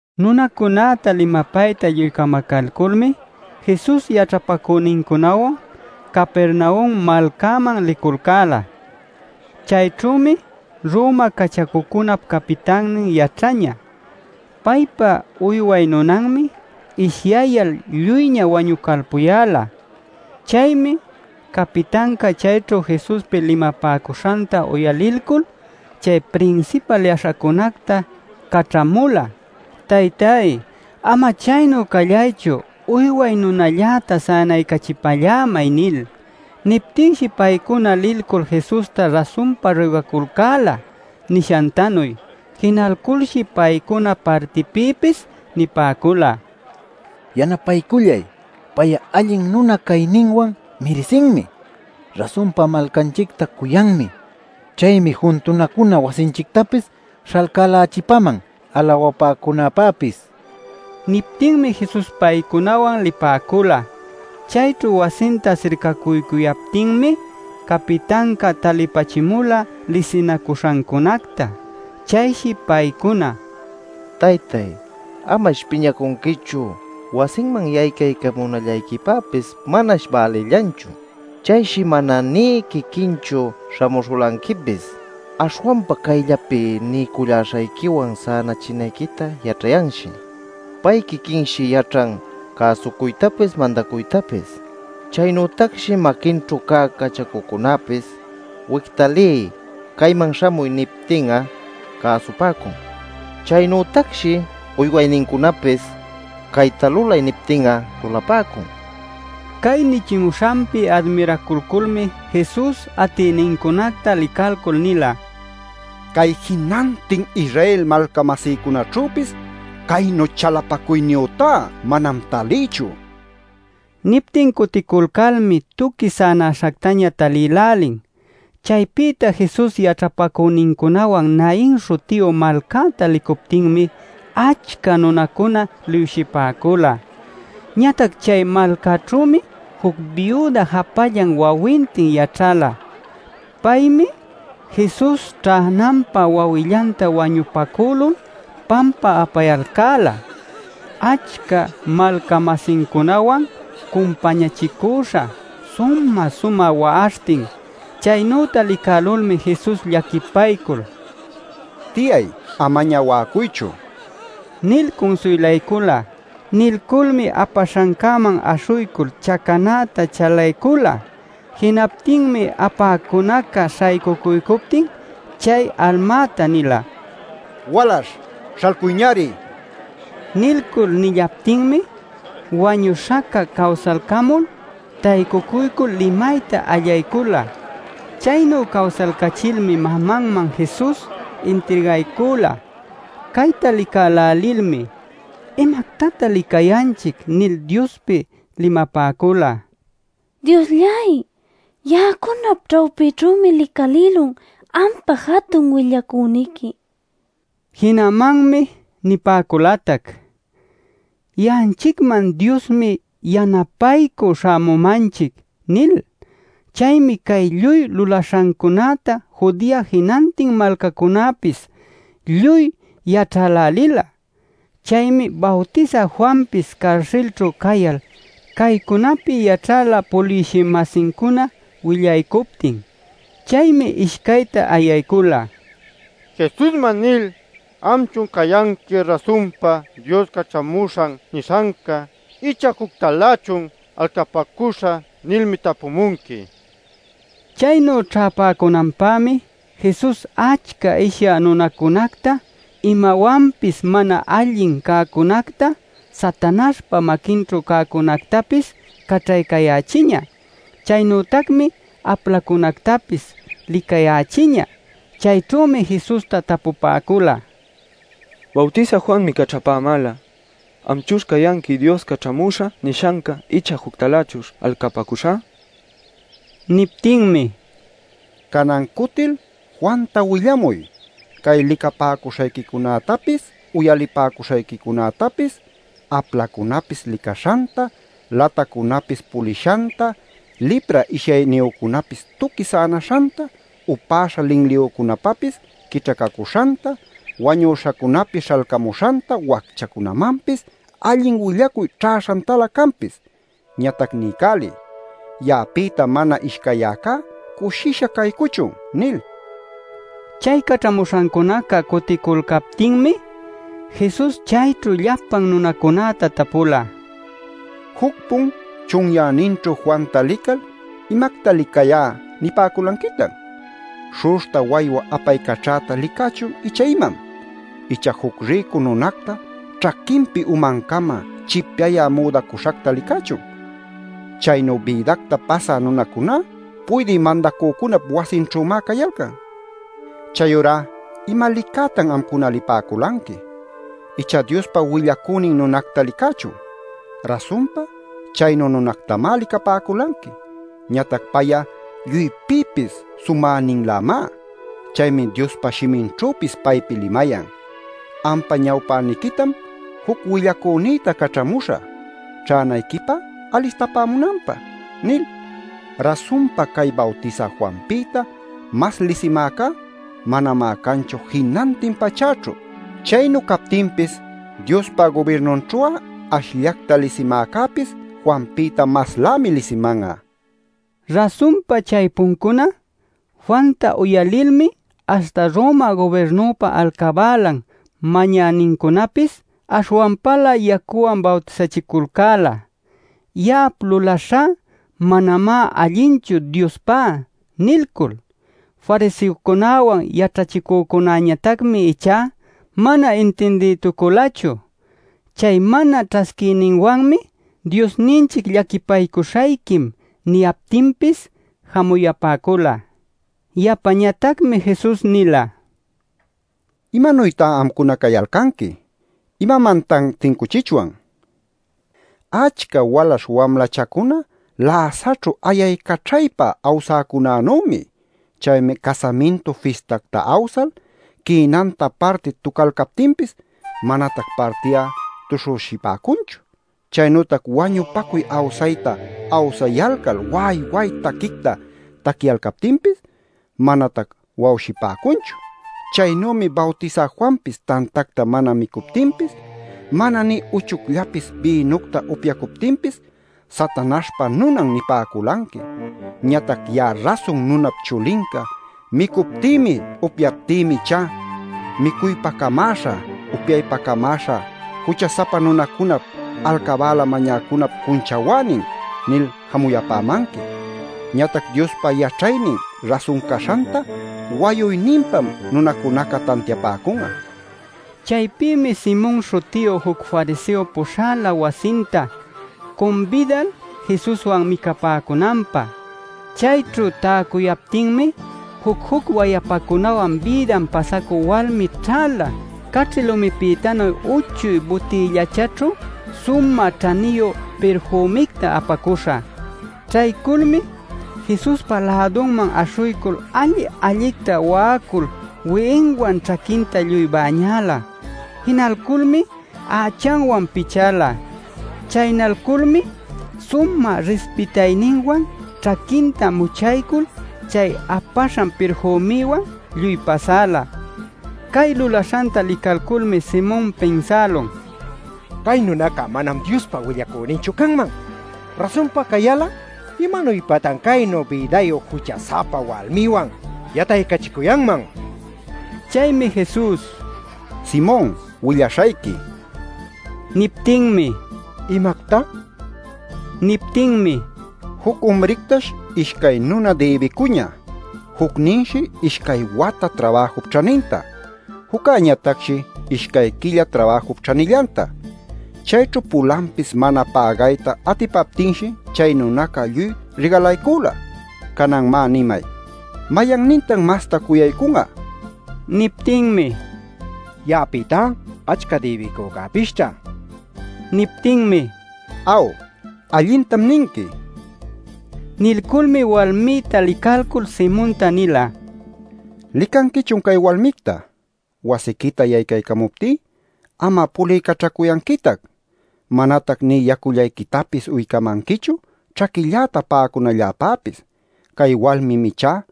Nunacunäta limapayta lluy camacalculmi Jesus yaćhapacünincunawan Capernaum malcäman liculcäla. Chayćhümi Roma cachacucunap capitannin yaćhañä. Paypa uyway nunanmi ishyayal lluyña wañucalpuyäla. Chaymi capitanca chayćhu Jesuspi limapäcuśhanta uyalilcul chay prinsipal yaśhacunacta caćhamula: “Taytáy, ama chaynu callaychu. Uyway nunalläta sänaycachipallämay” nil. Niptinshi paycuna lilcul Jesusta rasunpa ruygaculcäla nishantanuy. Jinalculshi paycuna partipïpis nipäcula: “Yanapaycullay. Pay'a allin nuna cayninwan mirisinmi. Rasunpa malcanchicta cuyanmi. Chaymi juntunacuna wasinchictapis śhalcälächipäman alawapäcunäpäpis” nil. Niptinmi Jesus paycunawan lipäcula. Chayćhu wasinta sircacuycuyaptinmi capitanca talipachimula lisinacuśhancunacta. Chayshi paycuna: “Taytáy, amash piñacunquichu. Wasinman yaycaycamunallayquipäpis manash bälillanchu. Chayshi mana nï quiquinchu śhamuśhulanquipis. Aśhwanpa cayllapi niycullaśhayquiwan sänachinayquita yaćhayanshi. Pay quiquinshi yaćhan cäsucuytapis mandacuytapis. Chaynütacshi maquinćhu cä cachacucunäpis ‘wicta liy’, ‘cayman śhamuy’ niptin'a cäsupäcun. Chaynütacshi uywaynincunapis ‘cayta lulay’ niptin'a lulapäcun” nila. Cay nichimuśhanpi admiracuculmi Jesus atïnincunäta licalcul nila: “¡Cay jinantin Israel malca-masïcunaćhüpis caynu chalapacuyniyütá manam talïchu!” nil. Niptin cuticulcalmi tuqui sänaśhactaña talïlälin. Chaypïta Jesus yaćhapacünincunawan Nain śhutiyu malcäta licuptinmi achca nunacuna liwshipäcula. Ñatac chay malcäćhümi juc biuda japallan wawintin yaćhala. Paymi Jesus ćhänanpä wawillanta wañupacülul pampa apayalcäla, achca malca-masincunawan cumpañachicüśha sumä-sumä wa'aśhtin. Chaynüta licälulmi Jesus llaquipaycul “Tiyay, amaña wa'acuychu” nil cunsuylaycula. Nilculmi apaśhancäman aśhuycul chacanäta chalaycula. Jinaptinmi apäcunaca śhaycuycuptin chay almäta nila: “Walaśh ¡śhalcuyñari!” nil. Nilcul nillaptinmi wañüśhaca cawsalcamul, taycucuycul limayta allaycula. Chaynu cawsalcachilmi mamanman Jesus intirgaycula. Cayta licälälilmi: “¿Imactatan licayanchic?” nil Diospi limapäcula: “Dioslláy, ya'acunap ćhawpïćhümi licalïlun ampa jatun willacüniqui” nil. Jinamanmi nipäculatac: “Ya'anchicman Diosmi yanapaycü śhamumanchic” nil. Chaymi cay lluy lulaśhancunäta Judea jinantin malcacunäpis lluy yaćhälälila. Chaymi Bawtisä Juanpis carsilćhu cayal caycunapi yaćhäla puliwshï-masincuna willaycuptin. Chaymi ishcayta ayaycula: “Jesusman lil ‘¿Amchun cayanqui rasunpa Dios caćhamuśhan nishanca ichá juctalächun alcapäcuśhä?’ nilmi tapumunqui” nil. Chaynu ćhäpäcunanpämi Jesus achca ishyä nunacunacta, imawanpis mana allin cäcunacta, Satanaśhpa maquinćhu cäcunätapis caćhaycayächiñä. Chaynütacmi aplacunactapis licayächiñä. Chayćhümi Jesusta tapupäcula: “Bawtisä Juanmi caćhapämäla ‘¿Amchuśh cayanqui Dios caćhamuśha nishanca icha juctalächuśh alcapäcuśha?’” nil. Niptinmi: “Canan cutil Juanta willamuy cay licapäcuśhayquicunätapis, uyalipäcuśhayquicunätapis: aplacunapis licaśhanta, latacunapis pulishanta, lipra ishyayniyücunapis tuqui sänaśhanta, upäśha linliyücunapapis quićhacacüśhanta, wañüśhacunapis śhalcamuśhanta, wacchacunämanpis allin willacuy ćhäśhantalä canpis. Ñatac niycäliy: ‘Ya'apïta mana ishcayyäcá cushisha caycuchun’ nil” nila. Chay caćhamuśhancuna cuticulcaptinmi Jesus chayćhu llapan nunacunäta tapula: “Juc-pun chunyäninćhu Juanta lical ‘¿Imacta licayá’ nipäculanquitan? ¿Śhu'uśhta waywa apaycaćhäta licächun ichá imam? ¿Icha juc rïcu nunacta ćhaquinpi umancama chipyayä müdacuśhacta licächun? Chaynu bïdacta pasä nunacuná puydï mandacücunap wasinćhümá cayalcan. ¿Chayurá ima licätan amcuna lipäculanqui? ¿Icha Diospa willacünin nunacta licächun? Rasunpa chaynu nunactamá licapäculanqui. Ñatac pay'a lluypïpis sumäninlämá. Chaymi Diospa shiminćhüpis paypi limayan: ‘Ampa ñawpäniquitam juc willacünïta caćhamüśhä, ćhänayquipä alistamunanpä’ nil. “Rasunpa cay Bawtisä Juanpïta mas lisimäcá manamá canchu jinantin pachäćhu. Chaynu captinpis Diospa gubirnunćhu'a ashllacta lisimäcäpis Juanpïta maslämi lisiman'a” nil. (Rasunpa chaypuncuná Juanta uyalilmi, aśhta Roma gubirnüpa alcabälan mañänincunapis aśhwanpalä yacuwan bawtisachiculcäla: “Ya'ap lulaśhá manamá allinchu Diospá” nilcul. Fariseocunäwan yaćhachicücunäñatacmi ichá mana intindïtuculachu. Chay mana ćhasquiyninwanmi Diosninchic “llaquipaycuśhayquim” niyaptinpis jamuyapäcula.) Yapañatacmi Jesus nila: “¿Imanuytá amcuna cayalcanqui? ¿Imamantan tincuchichwan? Achca walaśh wamlachacuna läsaćhu ayaycaćhaypa awsäcunänümi. Chaymi casamintu fistacta awsal quïnanta parti tucalcaptinpis, manatac parti'a tuśhüshipäcunchu. Chaynütac wañupacuy awsayta awsayalcal wa'ay wa'ay taquicta taquiyalcaptinpis manatac wa'awshipäcunchu. Chaynümi Bawtisä Juanpis tantacta mana micuptinpis, mana nï uchucllapis bïnucta upyacuptinpis ‘Satanaśhpa nunan’ nipäculanqui. Ñatac ya'a Rasun Nunap Chulinca micuptïmi, upyaptïmi ichá, ‘micuypä camäśha, upyaypä camäśha, jucha-sapa nunacunap, alcabäla mañäcunap cunchawänin’ nil jamuyapämanqui. Ñatac Diospa yaćhaynin rasun caśhanta wayuyninpam nunacunaca tantiapäcun'a” nil. Chaypïmi Simon śhutiyu juc fariseo puśhala wasinta cumbidal Jesuswan micapäcunanpä. Chayćhu täcuyaptinmi juc-juc wayapacunawan bïdan pasacü walmi ćhäla caćhi lumipïtanuy uchuy butïllachaćhu sumä ćhaniyu pirfümicta apacuśha. Ćhayculmi Jesuspa lädunman aśhuycul, alli-allicta wa'acul wi'inwan ćhaquinta lluy bäñäla. Jinalculmi ächanwan pichäla. Chaynalculmi sumä rispitayninwan ćhaquinta muchaycul chay apaśhan pirfümiwan lluy pasala. Cay lulaśhanta licalculmi Simon pinsälun: “Cay nunaca manam Diospa willacüninchu canman. Rasunpa cayal'a, ¿imanuypatan caynu bïdayu jucha-sapa walmiwan yataycachicuyanman?” nil. Chaymi Jesus: “Simon, willaśhayqui” nila. Niptinmi: “¿Imacta?” nin. Niptinmi: “Juc umrictash ishcay nuna dïbicuñä. Jucninshi ishcay wata trabajup ćhaninta; juccäñatacshi ishcay quilla trabajup ćhanillanta. Chayćhu pulanpis mana pägayta atipaptinshi, chay nunaca lluy rigalaycüla. Canan, má, nimay. ¿Mayannintan mastá cuyaycun'a?” nil. Niptinmi: “Ya'apïtá achca dïbicücäpisćha” nin. Niptinmi: “Aw, allintam ninqui” nila. Nilculmi walmïta licalcul Simonta nila: “¿Licanquichun cay walmicta? Wasiquita yaycamuptí, am'a puliycaćhacuyanquitac. Manatac nï yacullayquitapis uycamanquichu ćhaquilläta pa'acunalläpäpis. Cay walmim ichá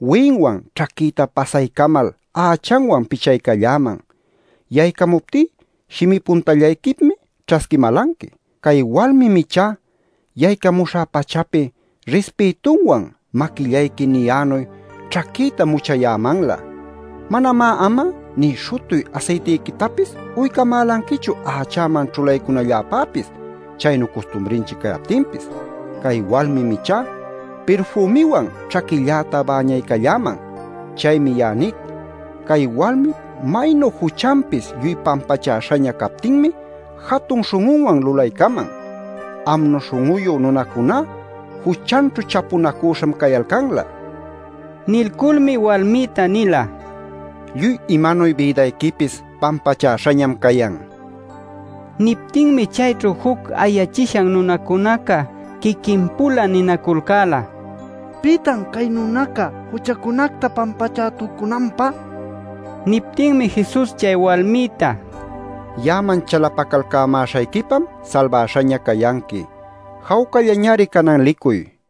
wi'inwan ćhaquïta pasaycamal ächanwan pichaycalläman. Yaycamuptí shimi puntallayquipmi ćhasquimälanqui. Cay walmim ichá yaycamuśhä-pachapi rispïtunwan maquillayqui niyänuy ćhaquïta muchayämanlä. Manamá am'a nï śhutuy asaytiquitapis uycamälanquichu ächäman ćhulaycunalläpäpis chaynu custumrinchic cayaptinpis. Cay walmim ichá pirfümiwan ćhaquilläta bäñaycalläman. Chaymi ya'a nic, cay walmip maynu juchanpis lluy pampachäśhaña captinmi jatun śhun'unwan lulaycaman. Amnu śhun'uyu nunacuná juchanćhu chapunacüśham cayalcanlä” nil. Nilculmi walmïta nila: “Lluy imanuy bïdayquipis pampachäśhañam cayan” nil. Niptinmi chayćhu juc ayachishan nunacunaca quiquin-pula ninaculcäla: “¿Pitan cay nunaca juchacunacta pampachätucunanpä?” nil. Niptinmi Jesus chay walmïta: “Ya'aman chalapacalcamäśhayquipam salbaśhaña cayanqui. Jawcallañari canan licuy” nila.